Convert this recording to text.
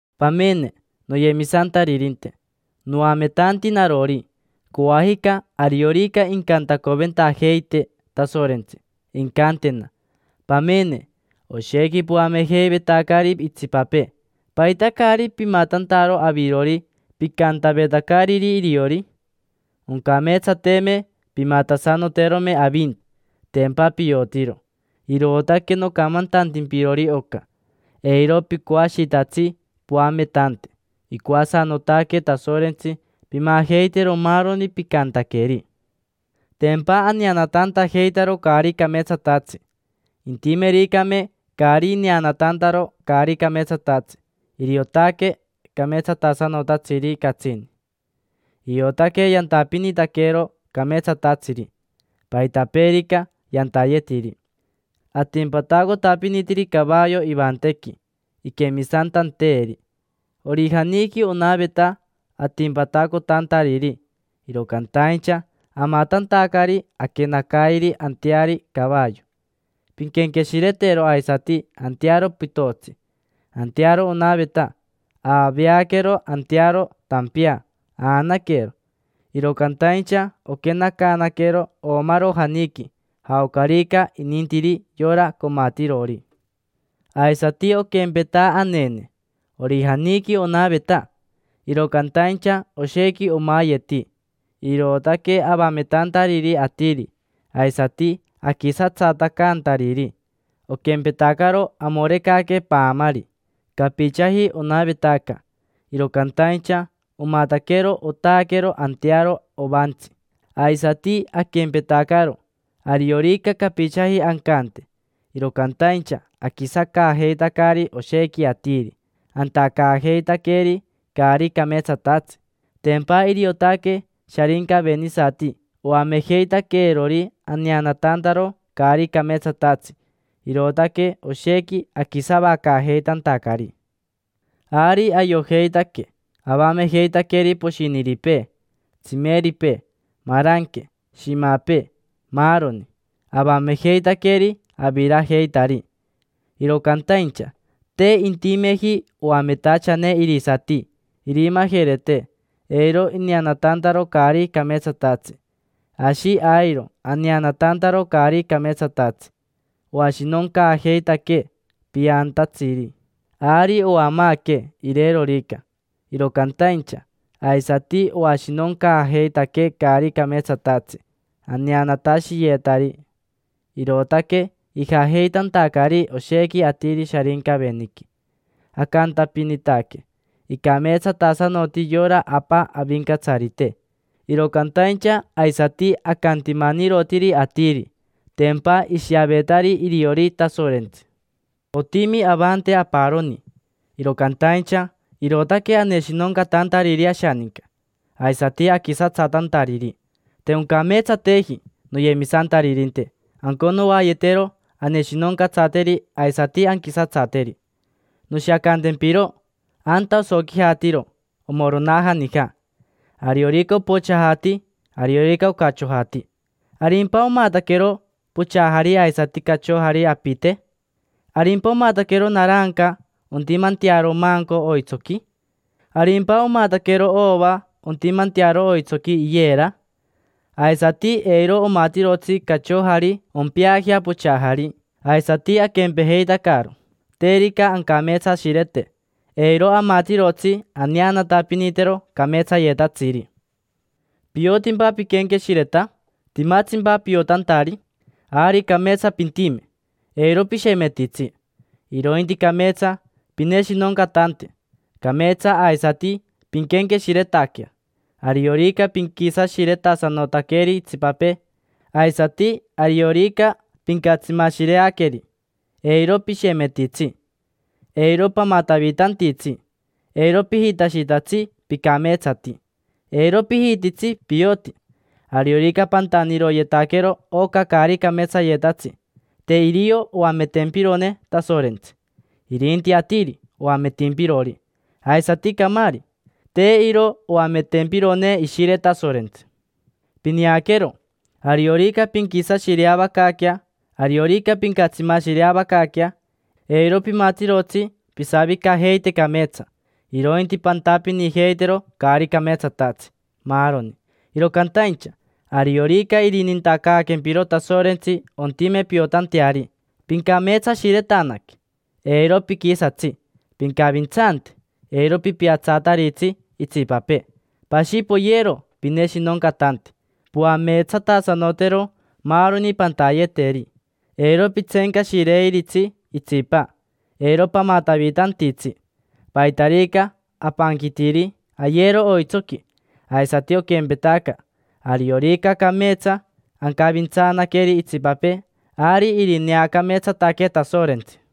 Pamene, noyemisantaririnte, noametanti narori. Coajica, ariorica incantacoventajeitee Tasorentsi, incantena: “Pamene, oshequi poamejeivetacari itsipapee: ¿paita caari pimatantaro avirori picantavetacariri iriori? Oncameetsateme pimatasanoterome avinti”. Tempa piotiro. Irootaque nocamantantimpirori oca: eiro picoashitatsi poametante. Icoasanotaque Tasorentsi pimajeitero maaroni picantaqueri. Tempa aneanatantajeitaro caari cameetsatatsi. Intimericame caari neanatantaro caari cameetsatatsi, iriotaque cameetsatasanotatsiri catsini; iotaque yantapinitaquero cameetsatatsiri, paitapeerica yantayetiri. Atimpatacotapinitiri cavayo ivantequi iquemisantanteeri. Orijaniqui onaveta atimpatacotantariri, iro cantaincha amatantacari aquenacairi anteari cavayo. Pinquenqueshiretero aisati antearo pitotsi. Antearo onaveta, aaveaquero antearo tampea aanaquero. Iro cantaincha oquenacaanaquero oomarojaniqui, jaocarica inintiri yora comatirori. Aisati oquempeta anene: orijaniqui onaveta, iro cantaincha oshequi omayeti: irootaque avametantariri atiri, aisati aquisatsatacantariri. Oquempetacaro amorecaque paamari, capichaji onavetaca, iro cantaincha omataquero otaaquero antearo ovaantsi. Aisati aquempetacaro, ariorica capichaji ancante, iro cantaincha aquisacaajeitacari oshequi atiri, antacaajeitaqueri caari cameetsatatsi. Tempa iriotaque sharincavenisati oamejeitaqueerori aneanatantaro caari cameetsatatsi, irootaque oshequi aquisavacaajeitantacari. Ari ayojeitaque avamejeitaqueri poshiniripee, tsimeripee, maranque, shimapee, maaroni. Avamejeitaqueri, avirajeitari. Iro cantaincha te intimeji oametachane irisati irimajerete eiro ineanatantaro caari cameetsatatsi. Ashi airo aneanatantaro caari cameetsatatsi. Oashinoncaajeitaquee piantatsiri, ari oamaaquee irerorica, iro cantaincha aisati oashinoncaajeitaquee caari cameetsatatsi aneanatashiyetari, irootaque ijajeitantacari oshequi atiri Sharincaveniqui. Acantapinitaque: “Icameetsatasanoti yora Apa Avincatsarite”. Iro cantaincha aisati acantimanirotiri atiri: tempa ishiavetari iriori Tasorentsi. Otimi avante aparoni, iro cantaincha irootaque aneshinoncatantariri ashaninca, aisati aquisatsatantariri. Te oncameetsateji, noyemisantaririnte, anconoayetero aneshinoncatsateri aisati anquisatsateri. Noshiacantempiro: anta osoquijatiro omoronaja nija, ariorica opochajati, ariorica ocachojati. ¿Arimpa omataquero pochajari aisati cachojari, apite? ¿Arimpa omataquero naranca ontimantearo manco oitsoqui? ¿Arimpa omataquero ova ontimantearo oitsoqui iyera? Aisati eiro omatirotsi cachojari ompeajea pochajari. Aisati aquempejeitacaro: terica ancameetsashirete, eiro amatirotsi aneanatapinitero cameetsayetatsiri. ¿Piotimpa piquenqueshireta? ¿Timatsimpa piotantari? Ari cameetsa pintime: eiro pishemetitsi, irointi cameetsa pineshinoncatante, cameetsa aisati pinquenqueshiretaquea. Ariorica pinquisashiretasanotaqueri itsipapee, aisati ariorica pincatsimashireaqueri, eiro pishemetitsi. Eiro pamatavitantitsi: eiro pijitashitatsi picameetsati, eiro pijititsi pioti. Ariorica pantaniroyetaquero oca caari cameetsayetatsi, te irio oametempirone Tasorentsi, irinti atiri oametimpirori, aisati camaari. Te iro oametempirone Ishire Tasorentsi. Pineaquero, ariorica pinquisashireavacaaquea, ariorica pincatsimashireavacaaquea, eiro pimatirotsi pisavicajeite cameetsa, irointi pantapinijeitero caari cameetsatatsi, maaroni. Iro cantaincha ariorica irinintacaaquempiro Tasorentsi ontime piotanteari, pincameetsashiretanaque, eiro piquisatsi, pincavintsante, eiro pipiatsataritsi itsipapee, pashi poyero pineshinoncatante, poameetsatasanotero maaroni pantayeteri, eiro pitseencashireiritsi itsipa, eiro pamatavitantitsi. Paitarica apanquitiri, ayero oitsoqui. Aisati oquempetaca, ariorica cameetsa ancavintsanaqueri itsipapee, ari irineacameetsataquee Tasorentsi.